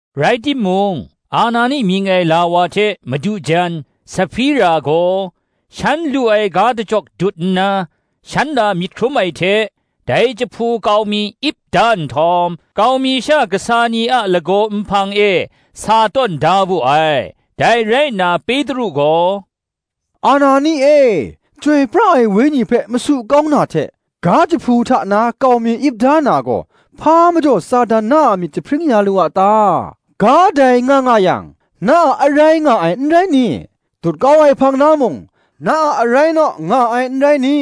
Rai timung, Anani mying ai la wa hte madu jan Sahpira gaw, shan lu ai ga dachyawk dut nna, shan la myit hkrum ai hte, dai jahpu kau mi ip da nhtawm, kau mi sha kasa ni a lagaw nhpang e sa tawn da wu ai. Dai rai nna Petru gaw, “Anani e, Chyoi pra ai Wenyi hpe masu kau na hte, ga jahpu hta na kau mi ip da na gaw, hpa majaw Satan na a myit jahpring ya lu a ta? ga dai nga nga yang, na a arai nga ai n rai ni? dut kau ai hpang na mung, na a arai naw nga ai n rai ni?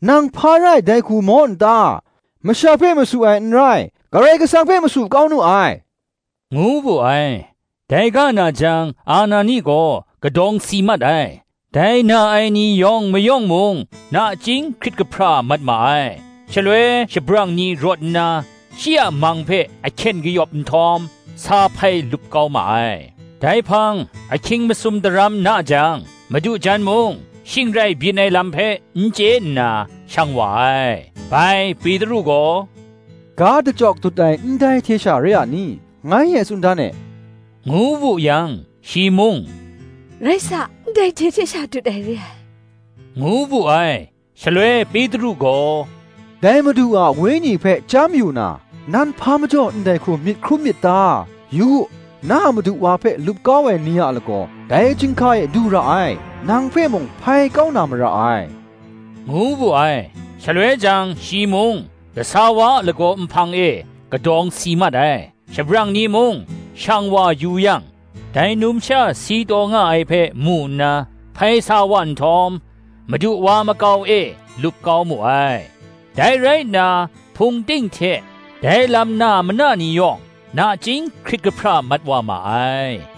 nang hpa rai dai hku maw n ta? masha hpe masu ai n rai, Karai Kasang hpe masu kau nu ai,” ngu wu ai. Dai ga na jang Anani gaw kadawng si mat ai: dai na ai ni yawng mayawng mung nachying hkrit kahpra mat ma ai. Shaloi shabrang ni rawt nna, shi a mang hpe ahkyen kayawp nhtawm, sa hpai lup kau ma ai. Dai hpang, ahkying masum daram na jang, madu jan mung, shing rai byin ai lam hpe n chye nna, shang wa ai. Bai Petru gaw, “Ga dachyawk dut ai, ndai hte sha re a ni? ngai e tsun dan e,” ngu wu yang, shi mung, “Rai sa, ndai hte hte sha dut ai re ai,” ngu wu ai. Shaloi Petru gaw, “Dai Madu a Wenyi hpe chyam yu na, nan hpa majaw ndai hku myit hkrum myit ta? Yu u, na a madu wa hpe lup kau ai ni a lagaw, dai chyinghka e du ra ai; nang hpe mung hpai kau na mara ai,” ngu wu ai. Shaloi jang shi mung kasa wa a lagaw nhpang e kadawng si mat ai: shabrang ni mung shang wa yu yang, dai numsha si taw nga ai hpe mu nna hpai sa wa nhtawm, madu wa makau e lup kau mu ai. Dai rai nna, Hpung ting hte, dai lam na mana ni yawng, nachying hkrit kahpra mat wa ma ai.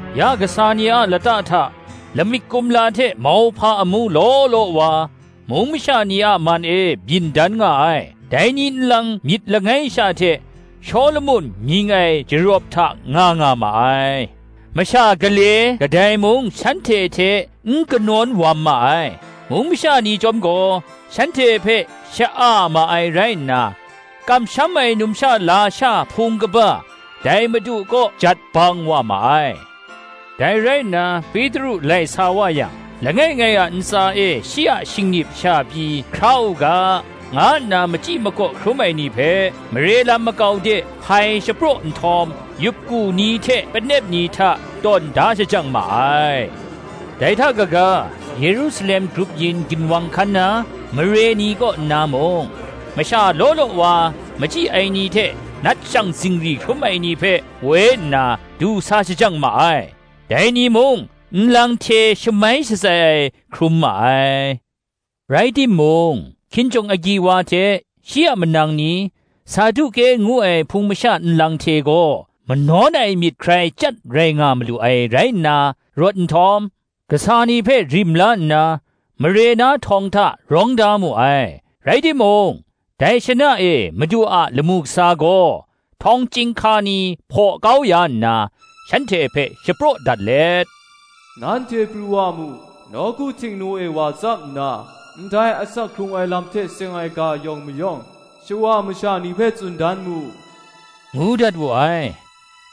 Ya kasa ni a lata hta lamik kumla hte mauhpa amu law law wa, mung masha ni a man e byin dan nga ai; dai ni nlang myit langai sha hte, Shawlumon mying ai jarawp hta nga nga ma ai. Masha gale kadai mung shanhte hte n kanawn wam ma ai: mung masha ni chyawm gaw, shanhte hpe sha-a ma ai rai nna kamsham ai numsha lasha hpung kaba, dai Madu kaw jat bang wa ma ai: dai rai nna, Petru lai sa wa yang, langai ngai a ntsa e shi a shingnip sha pyi hkra u ga, nga nna machyi makaw hkrum ai ni hpe, mare lam makau de hpai shapraw nhtawm yup ku ni hte panep ni hta, tawn da shajang ma ai. Dai hta kaga, Yerusalem grup yin ginwang hkan na mare ni kaw nna mung, masha law law wa machyi ai ni hte nat shang zingri hkrum ai ni hpe woi nna, du sa shajang ma ai; dai ni mung nlang hte shamai shatsai ai hkrum ma ai. Rai timung, hkinjawng agyi wa hte, shi a manang ni, Saduke ngu ai hpung masha nlang hte gaw, manawn ai myit hkrai chyat rai nga malu ai rai nna, rawt nhtawm kasa ni hpe rim la nna, mare na htawng hta rawng da mu ai. Rai timung, dai shana e Madu a lamu kasa gaw, htawng chyinghka ni hpaw kau ya nna, shanhte hpe shapraw dat let, “Nanhte pru wa mu, nawku Htingnu e wa tsap nna, ndai asak hkrung ai lam hte seng ai ga yawng mayawng, shawa masha ni hpe tsun dan mu,” ngu dat wu ai.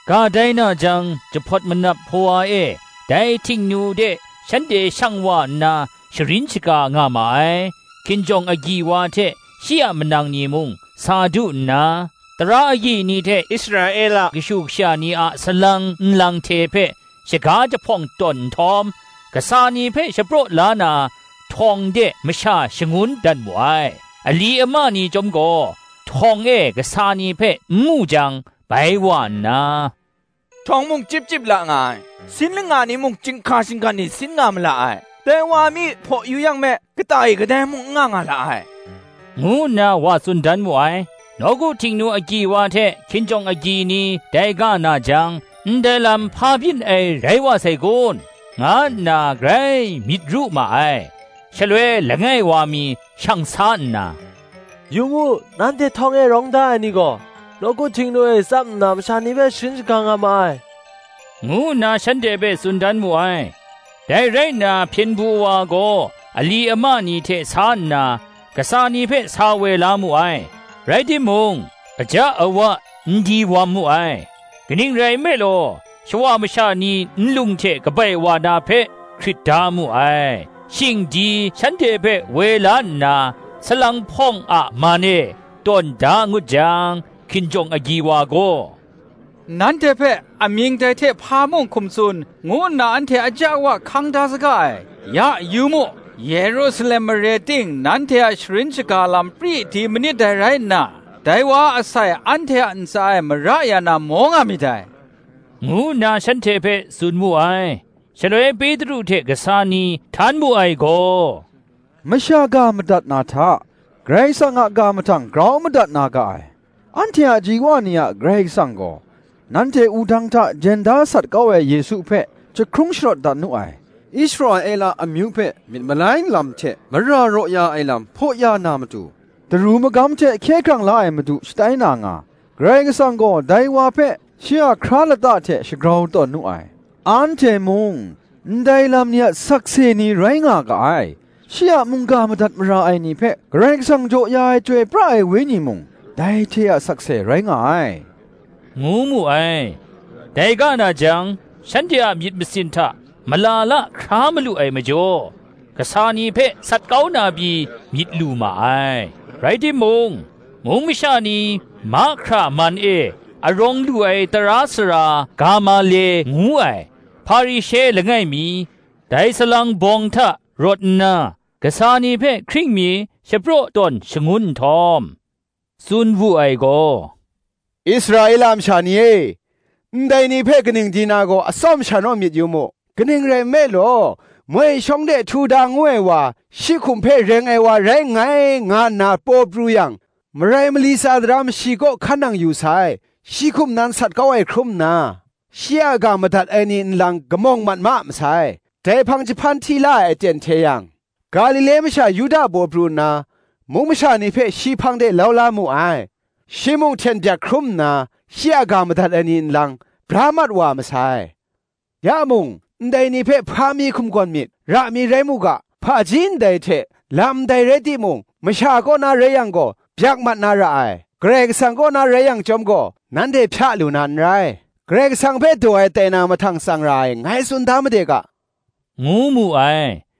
Ga dai na jang, jahpawt manap hpawa e dai Htingnu de shanhte shang wa nna sharin shaga nga ma ai. Hkinjawng agyi wa hte shi a manang ni mung sa du nna, tara agyi ni hte Israela kashu kasha ni a salang nlang hte hpe shaga jahpawng tawn nhtawm, kasa ni hpe shapraw la na htawng de masha shangun dat mu ai. Ali ama ni chyawm gaw, htawng e kasa ni hpe n mu jang, bai wa nna, “Htawng mung chyip chyip la nga ai, sin langa ni mung chyinghka shinggan e sin nga ma la ai; dai wa mi hpaw yu yang me, kata e kadai mung n nga nga la ai,” ngu nna wa tsun dan mu ai. nawku Htingnu agyi wa hte hkinjawng agyi ni dai ga na jang, ndai lam hpa byin ai rai wa sai kun, nga nna grai myit ru ma ai. Shaloi langai wa mi shang sa nna, “Yu mu, nanhte htawng e rawng da ai ni gaw, nawku Htingnu e tsap nna masha ni hpe sharin shaga nga ma ai,” ngu nna shanhte hpe tsun dan mu ai. Dai rai nna hpyen du wa gaw ali ama ni hte sa nna, kasa ni hpe sa woi la mu ai; rai timung, aja awa n di wam mu ai; kaning rai nme law, shawa masha ni nlung hte kabai wa na hpe, hkrit da mu ai. Shing di shanhte hpe woi la nna, salang hpawng a man e tawn da ngut jang, hkinjawng agyi wa gaw, “Nanhte hpe, amying dai hte hpa mung hkum tsun, ngu nna anhte aja awa hkang da saga ai; ya yu mu, Yerusalem mare ting nanhte a sharin shaga lam pri di manit dai rai nna, dai wa a asai anhte a ntsa e mara ya na maw nga myit dai,” ngu nna shanhte hpe tsun wu ai. Shaloi Petru hte kasa ni htan mu ai gaw, “Masha ga madat na hta, Karai Kasang a ga mahtang grau madat na ga ai. Anhte a ji wa ni a Karai Kasang gaw, nanhte wudang hta jen da sat kau ai Yesu hpe, jahkrung sharawt dat nu ai. Israela amyu hpe myit malai lam hte mara raw ya ai lam hpaw ya na matu, Daru Magam hte Hkye hkrang la ai Madu shatai na nga, Karai Kasang gaw dai wa hpe, shi a hkra lata hte shagrau tawn nu ai. Anhte mung ndai lam ni a sakse ni rai nga ga ai; shi a mungga madat mara ai ni hpe Karai Kasang jaw ya ai Chyoi pra ai Wenyi mung, dai hte a sakse rai nga ai,” ngu mu ai. Dai ga na jang, shanhte a myit masin hta mala la hkra malu ai majaw, kasa ni hpe sat kau na pyi myit lu ma ai. Rai timung, mung masha ni mahkra man e arawng lu ai tara sara Gamale ngu ai Hparishe langai mi, dai salang bawng hta rawt nna, kasa ni hpe hkring mi shapraw tawn shangun nhtawm, tsun wu ai gaw, “Israela masha ni e, ndai ni hpe kaning di na gaw atsawm sha naw myit yu mu. Kaning rai nme law, moi shawng de Htuda ngu ai wa, shi hkum hpe reng ai wa rai nngai, nga nna paw pru yang, marai mali tsa daram shi kaw hkan nang yu sai; shi hkum nan sat kau ai hkrum nna, shi a ga madat ai ni nlang kamawng mat ma masai. Dai hpang, jahpan hti la ai aten hte yang, Galile masha Yuda paw pru nna, mung masha ni hpe shi hpang de lau la mu ai; shi mung hten byak hkrum nna, shi a ga madat ai ni nlang, bra mat wa masai. Ya mung, ndai ni hpe hpa mi hkum gawn myit, ra mi rai mu ga; hpaji ndai hte, lam ndai rai timung, masha kaw na rai yang gaw, byak mat na ra ai: Karai kasang kaw na rai yang chyawm gaw, nanhte hpya lu na n rai; Karai Kasang hpe daw ai tai na mahtang tsang ra ai, ngai tsun da made ga,” ngu mu ai.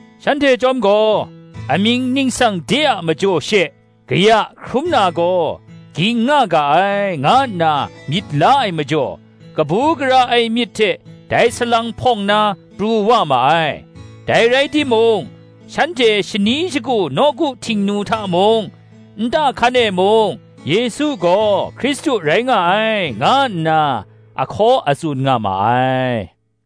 Shanhte chyawm gaw, Amying ningsang de a majaw she, kaya hkrum na gaw, ging nga ga ai, nga nna myit la ai majaw, kabu gara ai myit hte dai salang hpawng na pru wa ma ai. Dai rai timung, shanhte shani shagu nawku Htingnu hta mung, nta hkan e mung, Yesu gaw Hkristu rai nga ai, nga nna a hkaw a tsun nga ma ai.